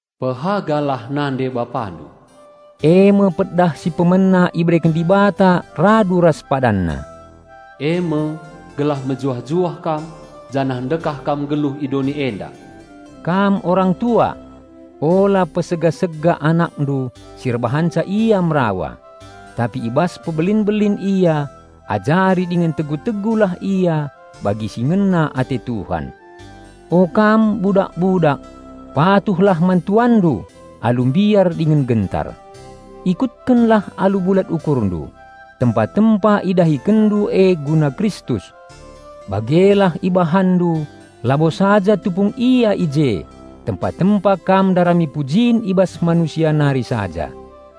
"Pehagalah nande-bapandu," eme pedah si pemena ibereken Dibata radu ras PadanNa. Eme, "gelah mejuah-juah kam, janah ndekah kam nggeluh i doni enda." Kam orang tua! Ula pesega-sega anakndu si erbahanca ia merawa. Tapi i bas mpebelin-belin ia ajari dingen tegu-tegulah ia bagi si ngena ate Tuhan. O kam budak-budak, patuhlah man tuanndu alu mbiar dingen gentar; ikutkenlah alu bulat ukurndu, tempa-tempa idahikenndu e guna Kristus. Bagelah ibahanndu labo saja tupung ia i je tempa-tempa kam ndarami pujin i bas manusia nari saja;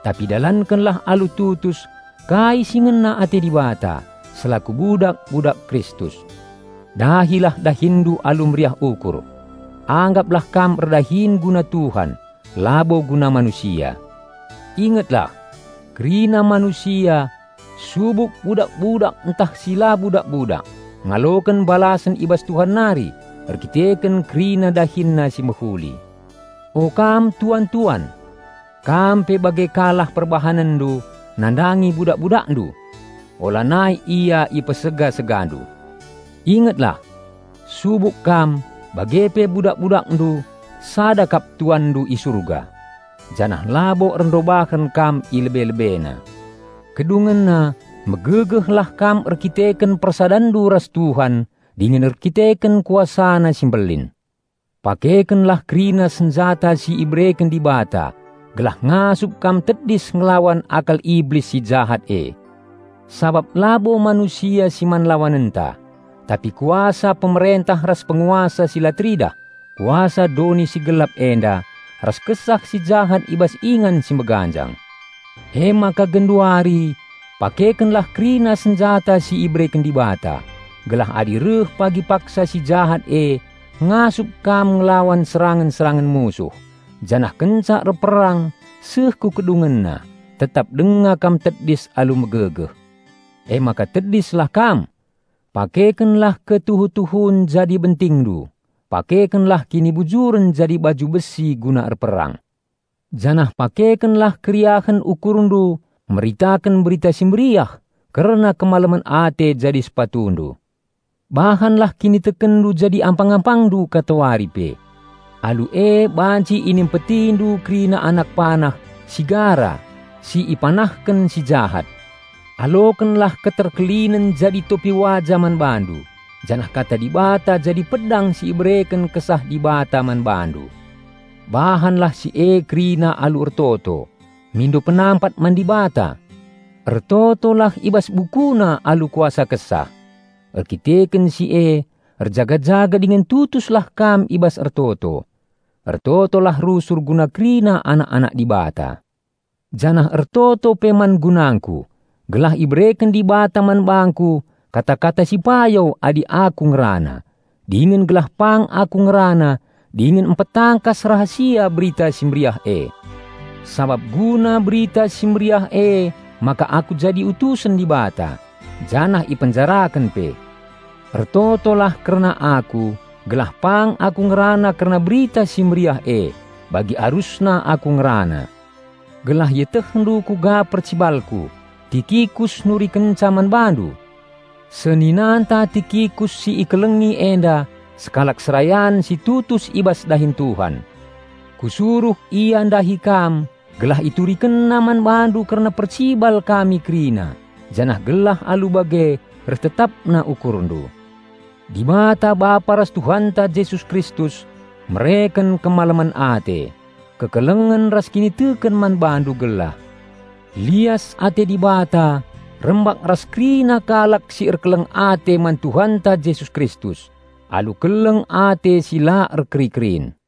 tapi dalankenlah alu tutus kai si ngena ate Dibata, selaku budak-budak Kristus. Dahilah dahinndu alu meriah ukur. Anggaplah kam erdahin guna Tuhan labo guna manusia. Ingetlah! Kerina manusia, subuk budak-budak ntah si la budak-budak, ngaloken balasen i bas Tuhan nari erkiteken kerina dahinna si mehuli. O kam tuan-tuan! Kam pe bage ka lah perbahanenndu nandangi budak-budakndu. Ulanai ia ipesega-segandu. Ingetlah! Subuk kam, bage pe budak-budakndu sada kap Tuanndu i Surga. Janah labo erndobahen kam i lebe-LebeNa. Kedungenna, megegehlah kam erdandanken persadanndu ras Tuhan dingen erdandanken KuasaNa si mbelin. Pakekenlah kerina senjata si ibereken Dibata gelah ngasup kam tedis ngelawan akal Iblis si jahat e. Sabap labo manusia si man lawanenta, tapi kuasa pemerentah ras penguasa si la teridah, kuasa doni si gelap enda, ras kesah si jahat i bas ingan si meganjang. Emaka genduari pakekenlah kerina senjata si ibereken Dibata, gelah adi reh pagi paksa si jahat e, ngasup kam ngelawan serangen-serangen musuh, janah kenca erperang seh ku kedungenna, tetap denga kam tedis alu megegeh. Emaka tedislah kam! Pakekenlah ketuhu-tuhun jadi bentingndu; pakekenlah kinibujuren jadi baju besi guna erperang. Janah pakekenlah keriahen ukurndu meritaken Berita Si Mehuli kerna kemalemen ate jadi sepatundu. Bahanlah kinitekenndu jadi ampang-ampangndu katawari pe. Alu e banci inimpetindu kerina anak panah si gara si ipanahken si Jahat. Alokenlah keterkelinen jadi topi waja man bandu, janah kata Dibata jadi pedang si ibereken Kesah Dibata man bandu. Bahanlah si e kerina alu ertoto, mindo penampat man Dibata. Ertotolah i bas bukuna alu kuasa Kesah. Erdandanken si e erjaga-jaga dingen tutuslah kam i bas ertoto. Ertotolah rusur guna kerina anak-anak Dibata. Janah ertoto pe man gunangku, gelah ibereken Dibata man bangku kata-kata si payo adi aku ngerana, dingen gelah pang aku ngerana dingen mpetangkas rahasia Berita Si Mehuli e. Sabap guna Berita Si Mehuli emaka aku jadi utusen Dibata, janah ipenjaraken pe. Ertotolah kerna aku, gelah pang aku ngerana kerna Berita Si Mehuli e, bagi arusna aku ngerana. Gelah ietehndu kuga percibalku, Tikikus nurikenca man bandu. Seninanta Tikikus si ikelengi enda sekalak serayan si tutus i bas dahin Tuhan. Kusuruh ia ndahi kam gelah iturikenna man bandu kerna percibal kami kerina, janah gelah alu bage reh tetapna ukurndu. Dibata Bapa ras Tuhanta Jesus Kristus mereken kemalemen ate, kekelengen ras kiniteken man bandu gelah. Lias ate Dibata rembak ras kerina kalak si erkeleng ate man Tuhanta Jesus Kristus alu keleng ate si la erkeri-kerin.